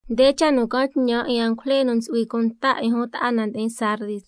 Nde cha' nu ca'an tñan 'in angujle nu ntsu'hui cunta 'in jun ta'a na ndi'in Sardis: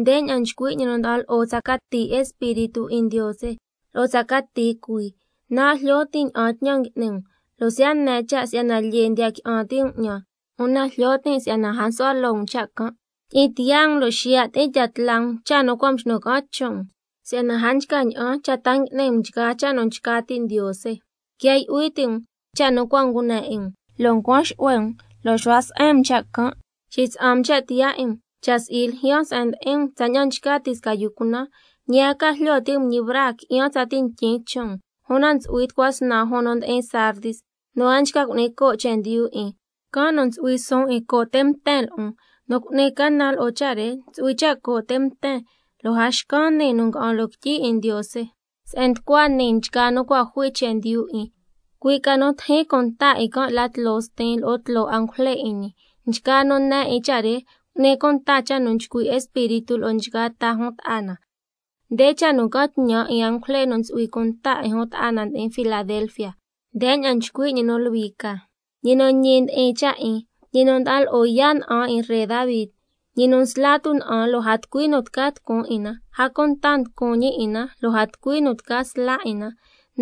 Ndeña'an nchcui' ñi nu nda'an lo'o tsa cati espíritu 'in Ndiose, lo'o tsa cati cuii: Nan' jlyo tin' ña'an tñan ngui'ni um, lo' siya' ne cha' si'yana lyee ndiya qui'an ti' um 'ñan, una jlyo tin' si'yana a nsu'hua loo um cha' can'. Tyi'in tiyaa um lo' xiya' tyi'in tya tla um cha' nu cua' mxnu ca'an chon' um, si'yana a nchca ña'an cha' ta ngui'ni um cha' nu nchca ti' Ndiose. Quia yu'hui ti' um cha' nu cua' ngune 'in um lo' ncuan xu'hue um, lo' xu'hua se'en um cha' can'. Xitsa'an um cha' tiyaa 'in um, cha' si'i, ljyaan se'en ndi'in um tsaña'an nchca ti' sca yu cunan, ñi a ca jlyo ti' um ñi braa qui'yan tsati ntyin chon' um. Una ntsu'hui tucua snan jun nu ndi'in Sardis nu a nchca cu'ni coo' chendyu 'in, can' nu ntsu'hui suun 'in co' te' mten lo'on. Nu cu'ni canan lo'o cha' re ntsu'hui cha' co' te' mten, lo' a xcan nii nu nga'an loo quityi 'in Ndiose, se'en nducua nii nchgaa nu cua' jui chendyu 'in, cui' ca nu tijin cunta 'in can' la tloo Stin lo'o tloo angujle 'in ñi. Nchgaa nu ne 'in cha' re, cu'ni cunta cha' nu nchcui' Espíritu lo'o nchgaa ta jun ta'a na. Nde cha' nu ca'an tñan 'in angujle nu ntsu'hui cunta 'in jun ta'a na ndi'in Filadelfia: Ndeña'an nchcui' ñi nu Luhui ca, ñi nu Ñi ndi'in cha' 'in, —ñi nu nda'an lo'o yaa' na'an 'in Ree Davi, ñi nu nsla tuna'an lo' a tucui nu tca tucun 'in na, a cunta nducun ñi 'in na, lo' a tucui nu tca sla 'in na—.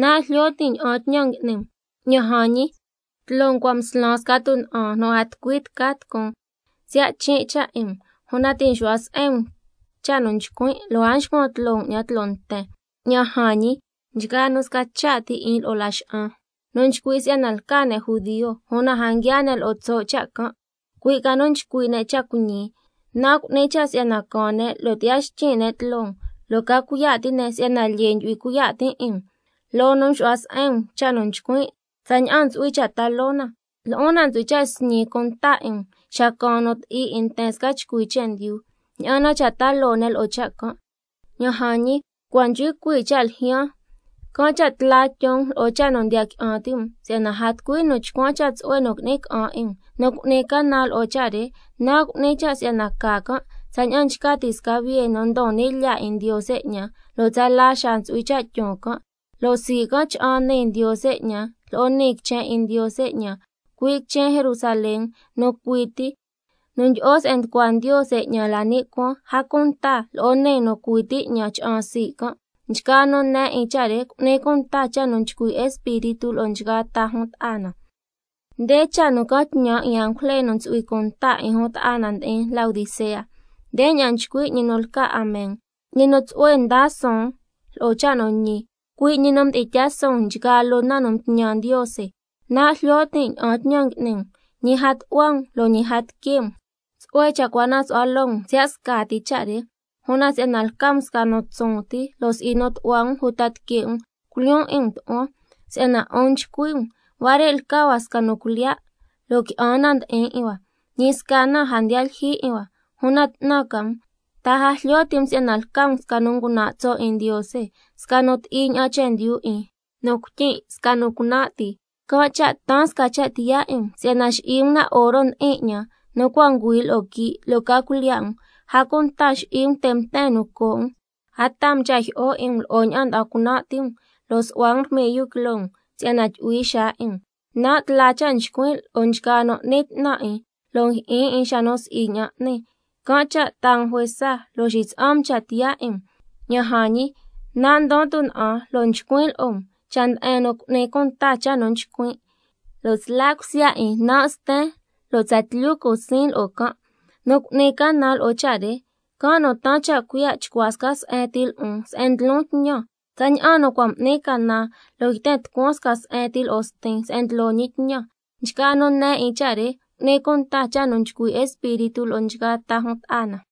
Nan' jlyo tin' ña'an tñan ngui'ni um, ña'an jan ñi, tloo um cua' mslan sca tuna'an nu a tucui tca tucun, siya' chin' cha' 'in um, una ti' nxu'hua se'en um cha' nu nchcuin', lo' a nxcuan tloo um 'ñan tloo nten. Ña'an jan ñi, nchgaa nu sca cha' ti 'in lo'o Laxa'an, nu nchcui' si'yana lca ne' judio, una a nguiaa ne' lo'o tso' cha' can', cui' ca nu nchcui' ne' cha' cuiñi, nan' cu'nin cha' si'yana caan ne' lo' tyi'ya xtyin' ne' tloo um, lo' ca cuiya' ti' ne' si'yana lca um nu lyee ndyu'hui cuiya' tin' 'in. Loo nu mxu'hua se'en um cha' nu ycuin' tsaña'an ntsu'hui cha' ta loo na, lo'on nan' ntsu'hui cha' sñin cunta 'in um xa caan nu ti'i 'in nten sca chcui chendyu, ña'an na cha' ta loo ne' lo'o cha' can'. Ña'an jan ñi, cua' nchcui cuii' cha' ljyaan, can' cha' tla tyon um lo'o cha' nu ndiya qui'an ti' um, si'yana a tucui nu chcuan cha' tsu'hue nu qui'ni ca'an 'in um. Nu cu'ni canan lo'o cha' re, nan' cu'nin cha' si'yana ca can' tsaña'an nchca ti' sca biye nu ndon ni' lyaa 'in Ndiose 'ñan, lo' tsala xaa ntsu'hui cha' tyon can', lo' sii' can' cha'an nii Ndiose 'ñan lo'o nii quichen 'in Ndiose 'ñan, cui' quichen Jerusalén nu cui ti nu ndyi'o se'en nducua Ndiose 'ñan la ni' cuaan, a cunta lo'o niin nu cui ti 'ñan cha'an sii' can'. Nchgaa nu ne 'in cha' re, cu'ni cunta cha' nu nchcui' Espíritu lo'o nchgaa ta jun ta'a na. Nde cha' nu ca'an tñan 'in angujle nu ntsu'hui cunta 'in jun ta'a na ndi'in Laodicea: Ndeña'an nchcui' ñi nu lca Amen, ñi nu tsu'hue nda suun lo'o cha' nu ñi, cui' ñi nu mdi'in tyaa suun nchgaa loo na nu mtñan Ndiose: Nan' jlyo tin' ña'an tñan ngui'ni um, ñi a tu'hua um lo' ñi a tique' um, tsu'hue ca cha' cua na su'hua loo um siya' scati cha' re. Una si'yana lca um sca nu tsun ti, lo' si'i nu tu'hua um uta tique' um, can' cha' culyoon 'in um tu'huan. Si'yana 'un nchcui' um: Huare' lca hua sca nu cuilyiya', lo' qui'an na ndi'in 'in hua, ñi sca na a ndiya lyijyi 'in hua. Una 'tnan ca um, ¿ta a jlyo ti' um si'yana lca um sca nu ngunan' tso' 'in Ndiose, sca nu ti'i ña'an chendyu 'in, nu cuityin', sca nu cunan' ti? Can' cha' taan sca cha' tiyaa 'in um si'yana xi'i um na oro ndi'in 'ñan, nu cua' ngüi lo'o quii', lo' ca cuilyiya' um, a cunta xi'i um te' mten nu co' um, a taa um cha' jyi'o 'in um lo'o ña'an nda'an cunan' ti um, lo' su'hua um rmiyu quiloo um si'yana tyu'hui xaa 'in um. Nan' tla cha' nchcuin' lo'o nchgaa nu n'ni 'tnan 'in, lo' njyi'in 'in xa nu si'i ña'an n'ni, can' cha' taa um juesa lo' xitsa'an um cha' tiyaa 'in um. Ña'an jan ñi, nan' ndon tuna'an lo' nchcuin' lo'o um, cha' nde'en nu cu'ni cunta cha' nu nchcuin', lo' sla cusya 'in, nan' sten lo' tsatlyu cu siin lo'o can'. Nu cu'ni canan lo'o cha' re, can' nu taan cha' cuiya' chcua sca se'en ti lo'on se'en ndlon tñan, tsaña'an nu cua' m'nin canan lo' yten tucuan sca se'en ti lo'o Stin se'en ndlo ñi tñan. Nchgaa nu ne 'in cha' re, cu'ni cunta cha' nu nchcui' Espíritu lo'o nchgaa ta jun ta'a na.